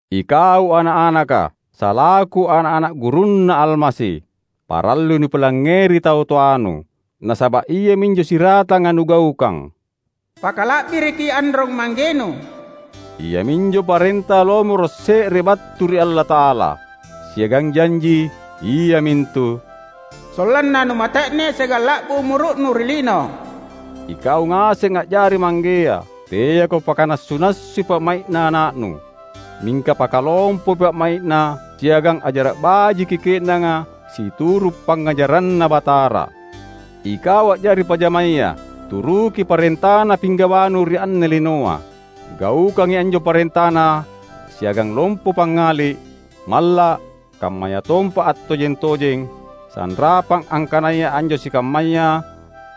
Ikau ana’-anaka! Salaku ana’-ana’ gurunNa Almasi, parallui nupilangngeri tau toanu, nasaba’ iaminjo siratanga nugaukang. "Pakala’biriki anrong-manggenu," iaminjo parenta lomoro’ se’re battu ri Allata’ala, siagang janji, iamintu: "Sollanna numate’ne siagang la’bu umuru’nu ri lino." Ikau ngaseng a’jari manggea! Teako pakanassu-nassui pa’mai’na ana’nu. Mingka pakalompoi pa’mai’na siagang ajara’ bajiki ke’nanga situru’ pangngajaranNa Batara. Ikau a’jari pajamaya! Turuki parentana pinggawanu ri anne linoa. Gaukangi anjo parentana siagang lompo pangngali’, malla’, kammayatompa attojeng-tojeng, sanrapang angkanaya anjo sikammaya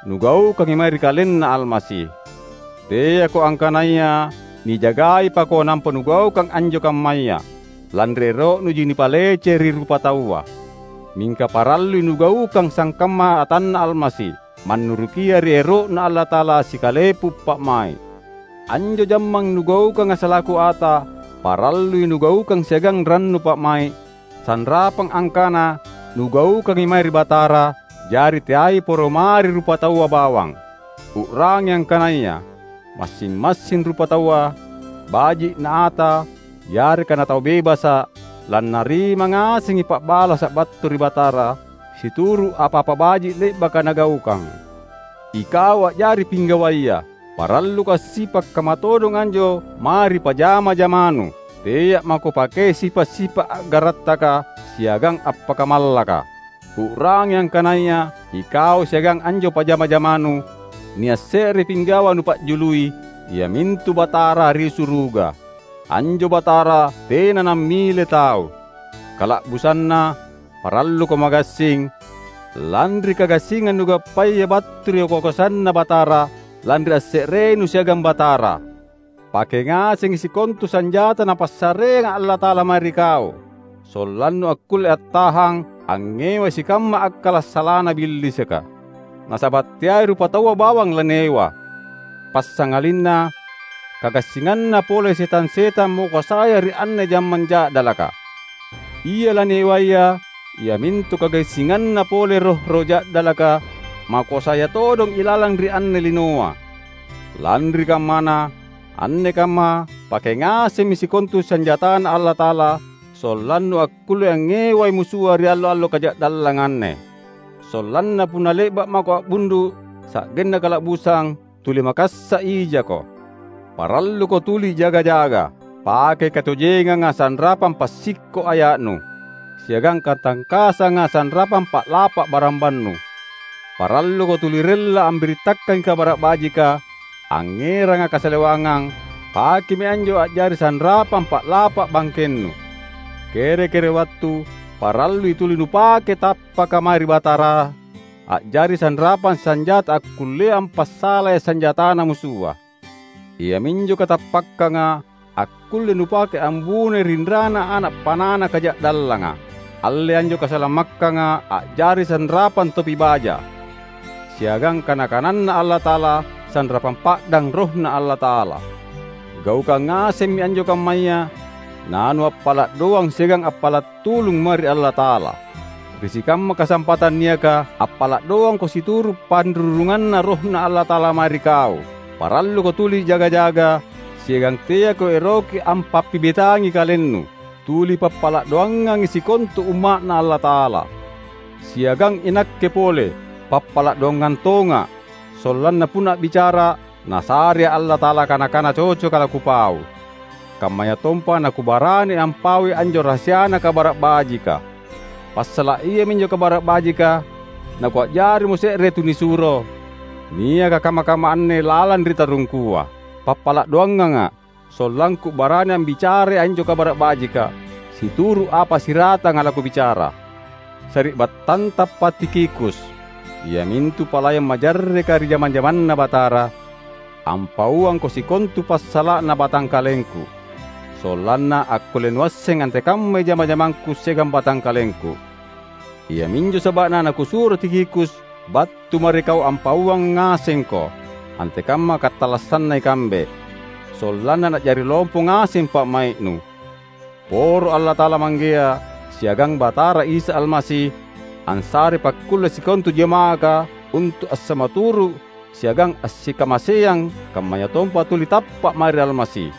nugaukangi mae ri KalenNa Almasi. Teako angkanaya nijagaipako nampa nugaukang anjo kammaya, lanri ero’nuji nipalece ri rupataua. Mingka parallui nugaukang sangkamma atanNa Almasi, mannurukia ri ero’Na Allata’ala sikalepu pa’mai’. Anjo jamang nugaukanga salaku ata, parallui nugaukang siagang rannu pa’mai’, sanrapang angkana nugaukangi mae ri Batara, jari teai poro mae ri rupataua bawang. U’rangi angkanaya, massing-massing rupataua, baji’ na ata yareka natau bebasa’, lannarima ngasengi pa’balasa’ battu ri Batara situru’ apa-apa baji’ le’baka nagaukang. Ikau a’jari pinggawaya! Paralluko assipa’ kamma todong anjo mae ri pajama-jamanu. Tea’ mako pakei sipa’-sipa’ a’garattaka siagang appakamallaka. U’rangi angkanaya ikau siagang anjo pajama-jamanu, nia’ se’re pinggawa nupa’jului, iamintu Batara ri suruga. Anjo Batara tena nammile tau. Kala’busanna, paralluko magassing, lanri kagassingang nugappaya battu ri kakoasanNa Batara, lanri asse’renu siagang Batara. Pake ngasengi sikontu sanjata Napassareanga Allata’ala mae ri kau; sollannu akkulle attahang angngewai sikamma akkala’ salana Billisika. Nasaba’ teai rupataua bawang laniewa, passangalinna kagassinganna pole setang-setang makoasaya ri anne jammang ja’dalaka. Ia laniewaya iamintu kagassinganna pole roh-roh ja’dalaka, makoasaya todong ilalang ri anne linoa. Lanri kammana, anne kamma pake ngasemmi sikontu sanjataNa Allata’ala sollannu akkulle angngewai musua ri allo-allo kaja’dallanga anne. Sollanna punna le’ba’ mako a’bundu’ sa’genna kala’busang, tuli makassa’ ijako. Paralluko tuli jaga-jaga. Pakei katojenganga sanrapang passikko’ aya’nu, siagang katangkasanga sanrapang pa’lapa’ barambannu. Paralluko tuli rella ambirittakangi Kabara’ Bajika, angngeranga kasalewangang; pakemi anjo a’jari sanrapang pa’lapa’ bangkennu. Kere-kere wattu parallui tuli nupake tappaka mae ri Batara a’jari sanrapang sanjata akkullea ampasalai sanjatana musua; iaminjo katappakkanga akkulle nupake ambunoi rinrana ana’ panana kaja’dallanga. Allei anjo kasalamakkanga a’jari sanrapang topi baja; siagang kana-kananNa Allata’ala sanrapang pa’dang RohNa Allata’ala. Gaukang ngasemmi anjo kammaya, nanuappala’ doang siagang appala’ tulung mae ri Allata’ala. Ri sikamma kasampatang niaka, appala’ doangko situru’ panrurunganNa RohNa Allata’ala mae ri kau. Paralluko tuli jaga-jaga, siagang teako eroki ampappibetangi kalennu. Tuli pappala’ doangangi sikontu Umma’Na Allata’ala. Siagang inakke pole, pappala’ doangang tonga’; sollanna punna a’bicara’, Nasarea’ Allata’ala kana-kana cocoka lakupau. Kammayatompa nakubarani ampaui anjo rahasiana Kabara’ Bajika. Passala’ iaminjo Kabara’ Bajika nakua’jarimo se’re tunisuro, niaka kamma-kamma anne lalang ri tarungkua. Pappala’ doanganga’, sollangku barani ambicarai anjo Kabara’ Bajika, situru’ apa siratanga lakubicara. Sari’battantapa Tikhikus, iamintu palayang majarreka ri jama-jamanNa Batara, ampauangko sikontu passala’na batangkalengku; sollanna akkulle nuasseng antekammai jama-jamangku siagang batangkalengku. Iaminjo saba’na nakusuro Tikhikus battu mae ri kau ampauang ngasengko antekamma katallassanna ikambe; sollanna na’jari lompo ngaseng pa’mai’nu. Poro Allata’ala Manggea, siagang Batara Isa Almasi ansarei pakkulle sikontu jama’aka untu’ assamaturu’ siagang assikamaseang kammayatompa tuli tappa’ mae ri Almasi.